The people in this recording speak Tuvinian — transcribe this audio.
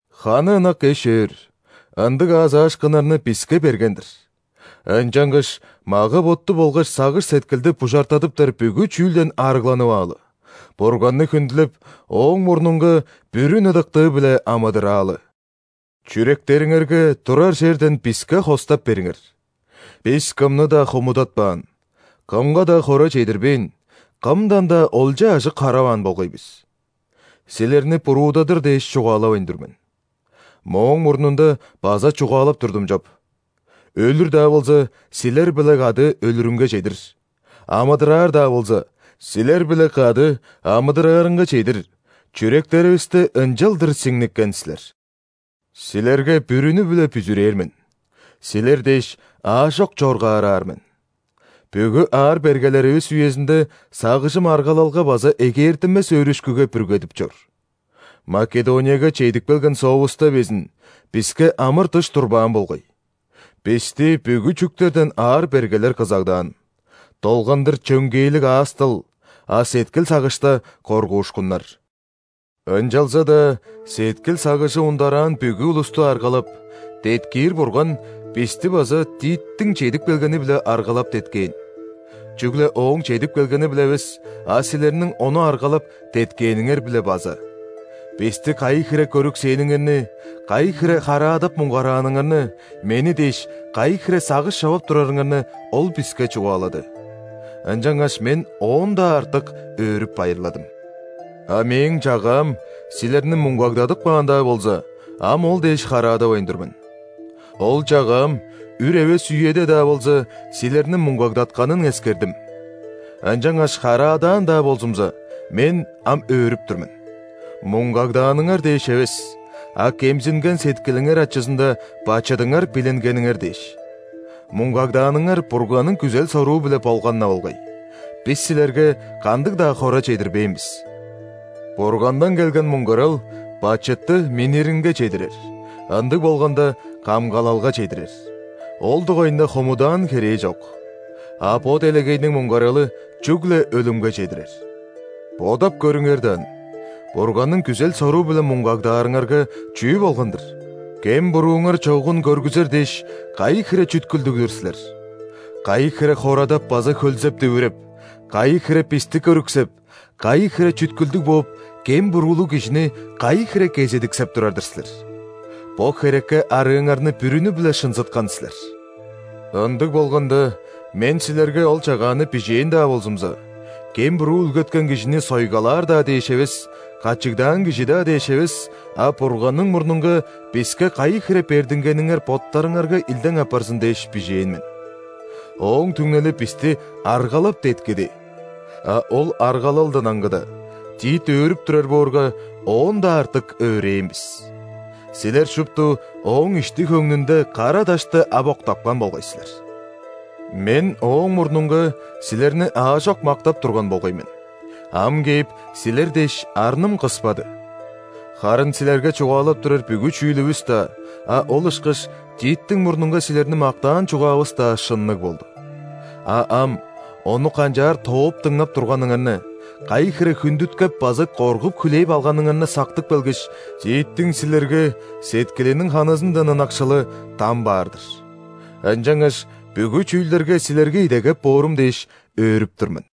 Ханы ынак эш-өөр, ындыг аазаашкыннарны биске берген-дир. Ынчангаш мага-ботту болгаш сагыш-сеткилди бужартадыптар бүгү чүүлден арыгланып аалы, Бурганны хүндүлеп, Ооң мурнунга бүрүн ыдыктыы-биле амыдыраалы! Чүректериңерге турар черден биске хостап бериңер! Бис кымны-даа хомудатпаан, кымга-даа хора чедирбээн, кымдан-даа олча-ажык хараваан болгай бис. Силерни буруудадыр дээш чугаалавайн тур мен. Мооң мурнунда база чугаалап турдум чоп: өлүр-даа болза, силер-биле кады өлүрүнге чедир, амыдыраар-даа болза, силер-биле кады амыдыраарынга чедир, чүректеривисте ынчалдыр сиңниккен силер. Силерге бүрүнү-биле бүзүрээр мен, силер дээш, аажок чоргаараар мен! Бүгү аар-бергелеривис үезинде сагыжым аргалалга база эгээртинмес өөрүшкүге бүргедип чор. Македонияга чедип келген соовуста безин, биске амыр-дыш турбаан болгай. Бисти бүгү чүктерден аар-бергелер кызагдаан: долгандыр чөңгээлиг аас-дыл, а сеткил-сагышта – коргуушкуннар. Ынчалза-даа сеткил-сагыжы ундараан бүгү улусту аргалап, деткиир Бурган бисти база Титтиң чедип келгени-биле аргалап, деткээн. Чүгле ооң чедип келгени-биле эвес, а силерниң ону аргалап, деткээниңер-биле база. Бисти кайы хире көрүксээниңерни, кайы хире хараадап муңгарааныңарны, мени дээш, кайы хире сагыш човап турарыңарны ол биске чугаалады. Ынчангаш мен оон-даа артык өөрүп-байырладым! А мээң чагаам силерни муңгагдадып каан-даа болза, ам ол дээш хараадавайн тур мен. Ол чагаам, үр эвес үеде-даа болза, силерни муңгагдатканын эскердим. Ынчангаш хараадаан-даа болзумза, мен ам өөрүп тур мен: муңгагдааныңар дээш эвес, а кемзинген сеткилиңер ачызында бачыдыңар билингениңер дээш. Муңгагдааныңар Бурганның күзел-соруу-биле болган-на болгай, бис силерге кандыг-даа хора чедирбээн бис! Бургандан келген муңгарал бачытты минниринге чедирер, ындыг болганда, камгалалга чедирер, ол дугайында хомудаан херээ чок. А бо делегейниң муңгаралы чүгле өлүмге чедирер. Бодап көрүңер даан: Бурганның күзел-соруу-биле муңгагдаарыңарга, чүү болган-дыр? Кем-бурууңар чогун көргүзер дээш, кайы хире чүткүлдүг-дүр силер! Кайы хире хорадап база хөлзеп-дүвүреп, кайы хире бисти көрүксеп, кайы хире чүткүлдүг бооп, кем-буруулуг кижини кайы хире кезедиксеп турар-дыр силер! Бо херекке арыыңарны бүрүнү-биле шынзыткан силер. Ындыг болганда, мен силерге ол чагааны бижээн-даа болзумза, кем-буруу үүлгеткен кижини сойгалаар-даа дээш эвес, качыгдаан кижи-даа дээш эвес, а Бурганның мурнунга биске кайы хире бердингениңер боттарыңарга илдең апарзын дээш, бижээн мен. Ооң түңнели бисти аргалап, деткиди! А ол аргалалдан аңгыда, Тит өөрүп турар боорга, оон-даа артык өөрээн бис. Силер шупту ооң ишти-хөңнүнде кара дашты ап октапкан болгай силер. Мен ооң мурнунга силерни аажок мактап турган болгай мен, ам кээп, силер дээш, арным кыспады! Харын силерге чугаалап турар бүгү чүүлүвүс-даа, а ол ышкаш Титтиң мурнунга силерни мактаан чугаавыс-даа шынныг болду. А ам, ону канчаар тооп дыңнап турганыңарны, кайы хире хүндүткеп база коргуп хүлээп алганыңарны сактып келгеш, Титтиң силерге сеткилиниң ханызындан ынакшылы дам баар-дыр. Ынчангаш бүгү чүүлдерге силерге идегеп боорум дээш, өөрүп тур мен!